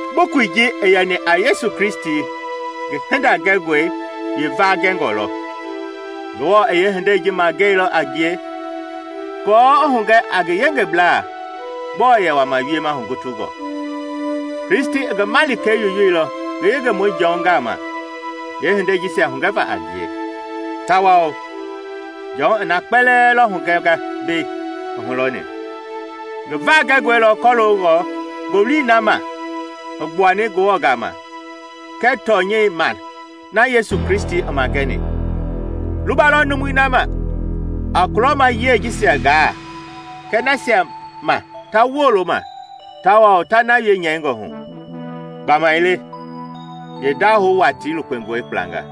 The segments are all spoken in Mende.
Bukui ji i yɛni a Yesu Kristi ngi hinda gɛngɔi yeevaa gɛngɔ lɔ. Ngewɔ i yeehindei ji magɛilɔ a ngie aako i hugɛ a ngi yengeblaa gbɔɔ yɛ wama wiema hugutungɔ. Kristi i ngi Malikei yoyoilɔ ngi yengemɔi Jɔn gama yeehinde jisia hugɛva a ngie, tawao Jɔn i na kpɛlɛɛ lɔ hugɛnga mbei i hulɔni. Ngi vaa gɛngɔi lɔ kɔloongɔ ngowili ma na i gbuani Ngewɔ gama kɛɛ tɔnyɛi ma na Yesu Kristi i magɛni. Luba lɔ numui ma a kulɔma yiɛi jisia gaa kɛɛ nasia ma ta woolo ma tawao ta na wie nyɛingɔ hu; gbamaile yeendahou watii lukpengɔi gblanga.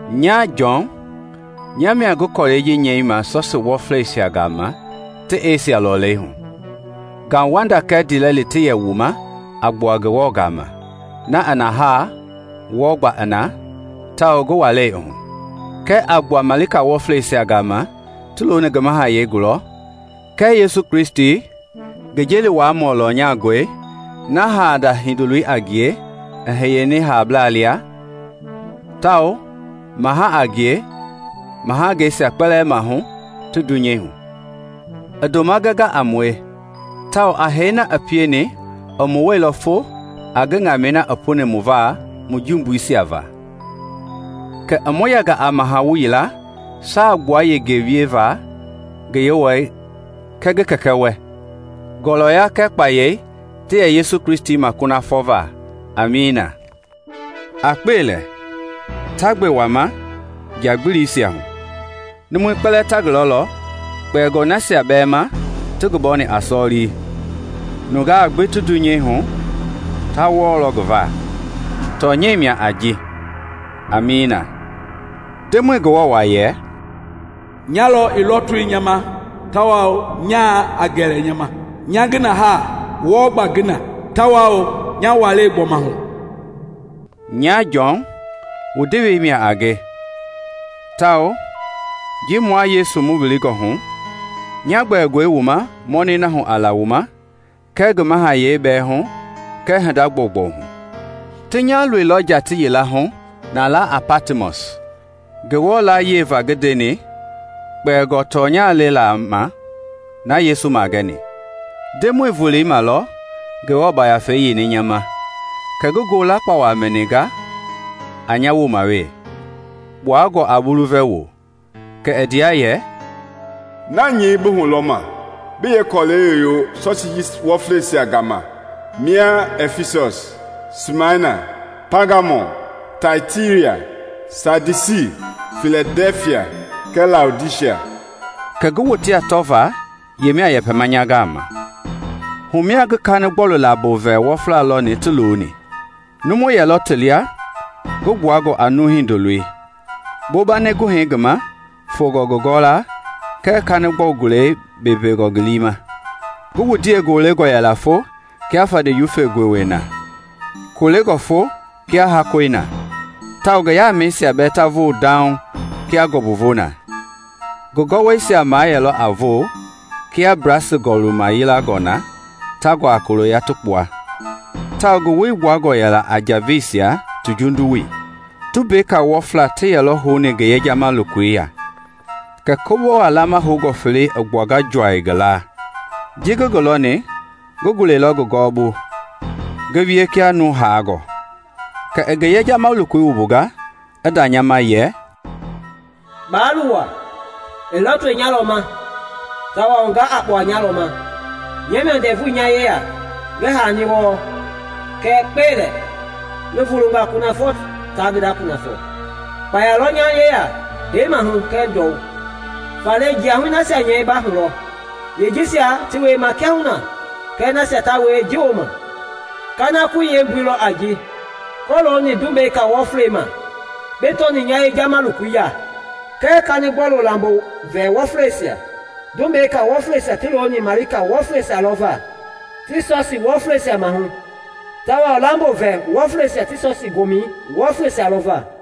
Nya, Jɔn, nya mia ngi kɔlɛi ji nyɛima sɔsii wɔfleisia gama ti Esia Lɔleihu: Ngauwanda kɛɛ ndiilɛli ti yɛ wu ma a gbua Ngewɔ gama, na i na haa, wɔɔ gbaa i na, tawao ngi walɛi hu, kɛɛ a gbua Ngafa Wɔfleisia gama ti looni ngi mahayɛi gulɔ, kɛɛ Yesu Kristi, ngi jeli wuaamɔ lɔnyangɔi na haala Hindolo le i hiyeni haablaa lia tawao maha a ngie mahangeisia kpɛlɛɛ maahu ti dunyei hu. I ndoma gɛnga a mue, tawao a hee na i pieni i mu wuailɔ fo a ŋamɛi na i puni mu va mu jumbuisia va. Kɛ i mu yɛnga a mahawu yila saagbua yengei wieva ngi Yewɔɛi kɛɛ ngi Kɛkɛ wɛ. Ngɔlɔya kɛɛ kpayei ti yɛ Yesu Kristi ma kunafɔ va! Amiina. A kpe lɛ, ta gbe wama nja gbilisia hu! Numui kpɛlɛɛ ta ngi lɔlɔ, kpɛlingɔ nasia bɛɛ ma ti ngi bɔni a sɔlii. Nungaa gbi ti dunyei hu ta wɔɔlɔ ngi va. Tɔnyɛi mia a ji! Amiina. Ndemɔi Ngewɔ wa yɛ, “Nya lɔ i lɔtoi nya ma tawao nyaa a gɛlɛ nya ma, nya ngi na haa, wɔɔ gbaa ngi na, tawao nya walɛi gbɔma hu.” Nya Jɔn, wu ndewei mia a nge, tawao ji mua Yesu mu wilingɔ hu, nya gbɛngɔe wu ma mɔnɛi hu a la wu ma kɛɛ ngi mahayɛi bɛɛ hu kɛɛ hinda gbɔugbɔu hu. Ti nya loilɔ tii yila hu na laa a Patmɔs Ngewɔ layie va ngi ndeni kpɛlingɔ tɔnyɛi le la ma na Yesu magɛni. Ndemɔi voloi ma lɔ Ngewɔ Yafei i yeini nya ma, kɛ ngi ngo lakpawa mɛninga a nya woma wee, kpuangɔ a bulu vɛwoi. Kɛ i ndea yɛ, “Na nyɛi bi hulɔma, bi yee kɔlɛi yoyo sɔsii wɔflei jisia gama: mia Ɛfisɔs, Simana, Paagamɔm, Taitira, Saadisi, Filadɛfia, kɛɛ Laodisia.” Kɛ ngi wotea tɔva yemia yɛpɛma nya gama. Humia ngi kanigbɔlu lambo vɛ wɔfla lɔni ti looni. Numu yɛlɔ ti lia ngi gbuangɔ a nuu hindoloi, bombani guhɛi ngi ma fongɔ ngi gɔwɔlaa kɛɛ kanigbɔlu gulei beebeengɔ ngi liima. Ngi wundiei golengɔ yɛla fo kia fande gowei na, kolengɔ fo kia hakɔi na, tawao ngi yaamɛisia bɛɛ ta voo dauŋ kia ngɔmbui voi na. Ngi gɔwɔisia mayɛlɔ a voo kia blasi gɔlu mayiangɔi na ta guaa kuliya ti kpua, tawao ngi woi gbuangɔ yɛla a njaveisia ti jundu woi. Tumbeka wɔfla ti yɛlɔ houni ngi yejama lokoi ya, kɛ kɔbowa laama houngɔ felei i gbuanga juaŋ ngi laa. Ji ngi ngi lɔni, ngi gulɛilɔ ngi gɔwɔbu ngi wie kia nuu haangɔ. Kɛ i ngi yejama lokoi wumbunga i nda nya ma, yɛ “Baa luwa! I lɔtoi nyalɔ ma, tawao ga a kpua nyalɔ ma. Nya mia ndɛvu nya yeya ngi haani wɔɔ, kɛɛ kpe lɛ, ngi vulunga kunafɔ ta ngi nda kunafɔ. Kpaya lɔ nya yeya hee maahu kɛɛ ndɔu. Faale jiahui nasia nyɛi ba hu lɔ, yee jisia ti wiema kiahuna kɛɛ nasia ta wie ji woma. Kanakoi yeembui lɔ a ji kɔlooni tumbeka wɔfleisia ma bi tɔni nya yejama lokoi ya kɛɛ kanigbɔlu lambo vɛ wɔfleisia; tumbeka wɔfleisia ti looni malika wɔfleisia lɔ va ti sɔsii wɔfleisia maahu, tawao lambo vɛ wɔfleisia ti sɔsii gomɛ wɔfleisia lɔ va.